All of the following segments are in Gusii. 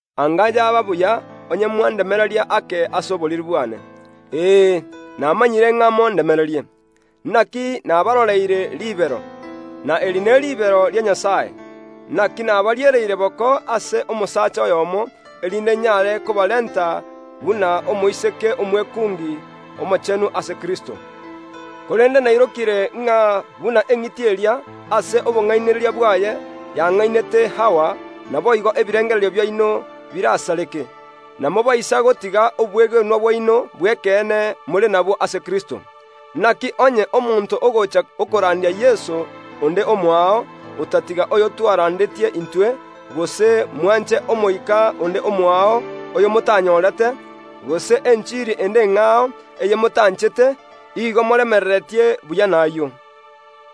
Anga yaba buya onye mwandemereria ake ase oboriri bwane. Ee, namanyire ng’a mondemererie. Naki nabaroreire ribero, na eri neribero ria Nyasae; naki nabariereire boko ase omosacha oyomo, erinde nyare kobarenta buna omoiseke omwekungi omochenu ase Kristo. Korende nairokire ng’a buna eng’iti eria, ase obong’ainereria bwaye, yang’ainete Hawa, naboigo ebirengererio biaino birasareke, na mobaise gotiga obwegenwa bwaino bw’ekeene more nabwo ase Kristo. Naki onye omonto ogocha okorandia Yeso onde omoao, otatiga oyo twarandetie intwe, gose mwanche omoika onde omoao oyomotanyorete, gose enchiri ende eng’ao eyemotanchete, igo moremereretie buya nayio.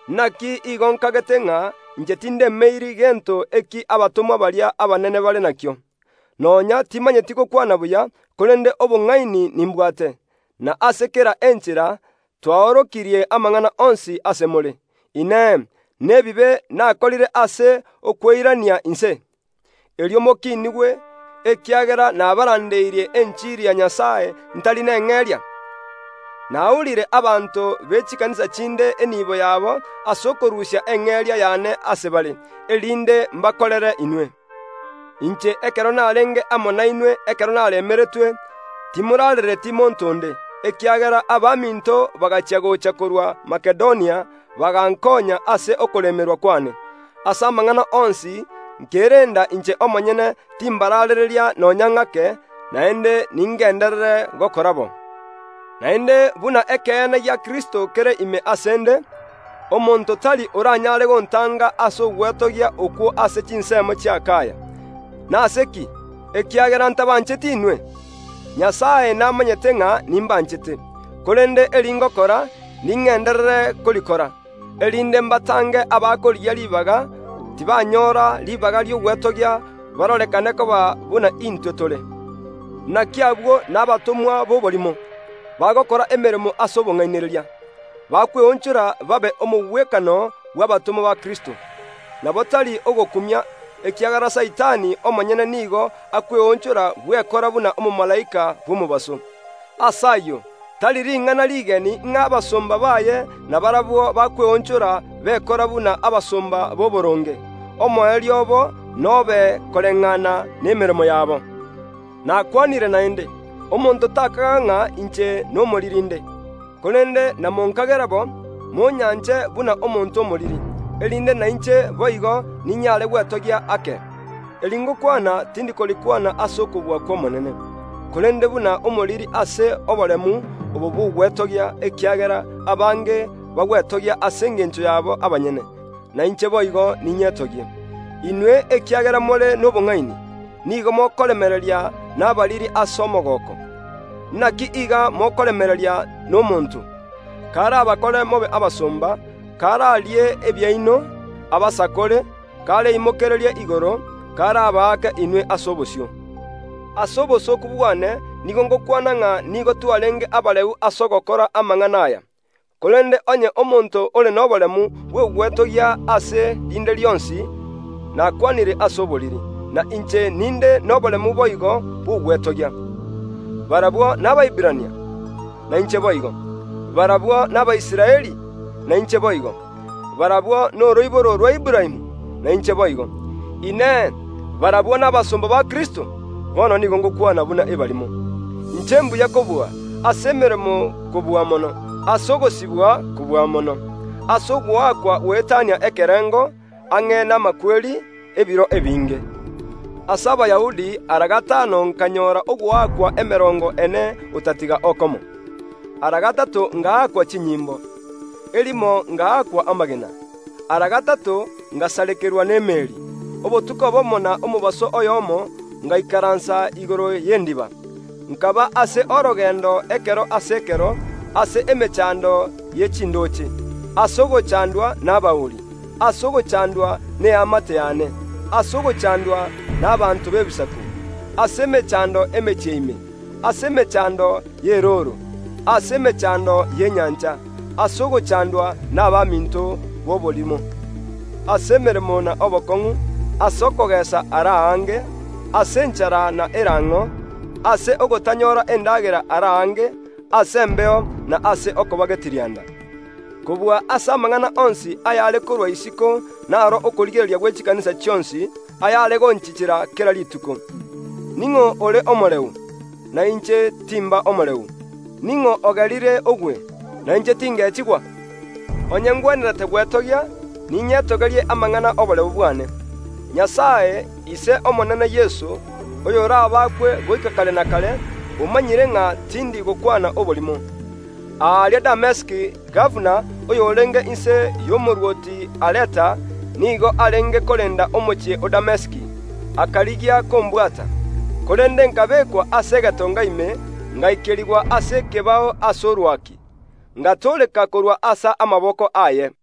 Naki igo nkagete ng’a inche tindemeiri gento eki abatomwa baria abanene bare nakio. Nonya timanyeti gokwana buya, korende obong’aini nimbwate, na ase kera enchera twaorokirie amang’ana onsi ase more. Inee! Nebibe nakorire ase okweirania inse, erio mokiinigwe, ekiagera nabarandeirie enchiri ya Nyasae ntari neng’eria? Naurire abanto be chikanisa chinde enibo yabo ase okorusia eng’eria yane ase bare, erinde mbakorere inwe. Inche ekero narenge amo nainwe ekero naremeretwe, timorarereti monto onde, ekiagera abaminto bagachia gocha korwa Makedonia bagankonya ase okoremerwa kwane. Ase amang’ana onsi nkerenda inche omonyene timbaraarereria nonya ng’ake, naende ningenderere gokora bo. Naende buna ekeene gia Kristo kere ime ase ’nde, omonto tari oranyare gontanga ase ogwetogia okwo ase chinsemo chi’Akaya. Nase ki? Ekiagera ntabancheti inwe? Nyasae namanyete ng’a nimbanchete! Korende eri ngokora, ningenderere korikora, erinde mbatange abakorigia ribaga tibanyora ribaga ri’ogwetogia barorekane koba buna intwe tore. Naki abwo nabatomwa b’oborimo, bagokora emeremo ase obong’ainereria, bakweonchora babe omogwekano bw’abatomwa ba Kristo. Nabo tari ogokumia, ekiagera Saitani omonyene nigo akweonchora bwekora buna omomalaika bw’omobaso. Ase ayio tari ring’ana rigeni ng’a abasomba baye nabarabwo bakweonchora bekora buna abasomba b’oboronge. Omoerio obo nobe koreng’ana nemeremo yabo. Nakwanire naende, omonto takaga ng’a inche nomoriri inde; korende namonkagera bo, monyanche buna omonto omoriri, erinde nainche boigo ninyare gwetogia ake. (Eri ngokwana tindi korikwana ase okobua kw’Omonene, korende buna omoriri ase oboremu obo bw’ogwetogia ekiagera abange bagwetogia ase engencho yabo abanyene, na inche boigo ninyetogie). Inwe, ekiagera more nobong’aini, nigo mokoremereria nabariri ase omogooko. Naki iga mokoremereria nomonto, karabakore mobe abasomba, kararie ebiaino, abasakore, kareimokererie igoro, karabaake inwe ase obosio. Ase obosooku bwane nigo ngokwana ng’a nigo twarenge abareu ase ogokora amang’ana aya. Korende onye omonto ore noboremu bw’ogwetogia ase rinde rionsi (nakwanire ase oboriri), na inche ninde noboremu boigo bw’ogwetogia. Barabwo n’Abaiberania? Nainche boigo. Barabwo n’Abaisraeli? Nainche boigo. Barabwo noroiboro rwa Aburaamu? Nainche boigo. Inee! Barabwo nabasomba ba Kristo? (Bono nigo ngokwana buna ebarimo). Inche mbuya kobua; ase emeremo kobua mono, ase ogosibwa kobua mono, ase ogoakwa goetania ekerengo, ang’e namakweri ebiro ebinge. Ase Abayahudi ara gatano nkanyora ogoakwa emerongo ene otatiga okomo. Ara gatato ngaakwa chinyimbo, erimo ngaakwa amagena. Ara gatato ngasarekerwa nemeeri, obotuko obomo na omobaso oyomo ngaikaransa igoro y’endiba; nkaba ase orogendo ekero ase ekero, ase emechando ye chindooche, ase ogochandwa nabauri, ase ogochandwa neamate yane, ase ogochandwa nabaanto b’Ebisaku, ase emechando emechie ime, ase emechando y’erooro, ase emechando y’enyancha, ase ogochandwa nabaminto b’oborimo; ase emeremo na obokong’u, ase okogeesa ara aange, ase enchara na erang’o, ase ogotanyora endagera ara aange, ase embeo na ase okoba getirianda. Kobua ase amang’ana onsi ayare korwa isiko naro okorigereria gwe chikanisa chionsi, ayare gonchichera kera rituko. Ning’o ore omoreu, na inche timba omoreu? Ning’o ogerire ogwe, na inche tingechigwa? Onye ngwenerete gwetogia, ninyetogerie amang’ana ’oboreu bwane. Nyasae, Ise Omonene Yeso, oyorabakwe goika kare na kare, omanyire ng’a tindi gokwana oborimo. Ekero narenge aaria Damesiki gabana, oyorenge inse y’omorwoti Areta, nigo arendete omochie o Damesiki, erio ambwate. Korende nkabekwa ase egetonga ime, ngaikerigwa ase ekebao ase orwaki, ngatooreka korwa ase amaboko aye.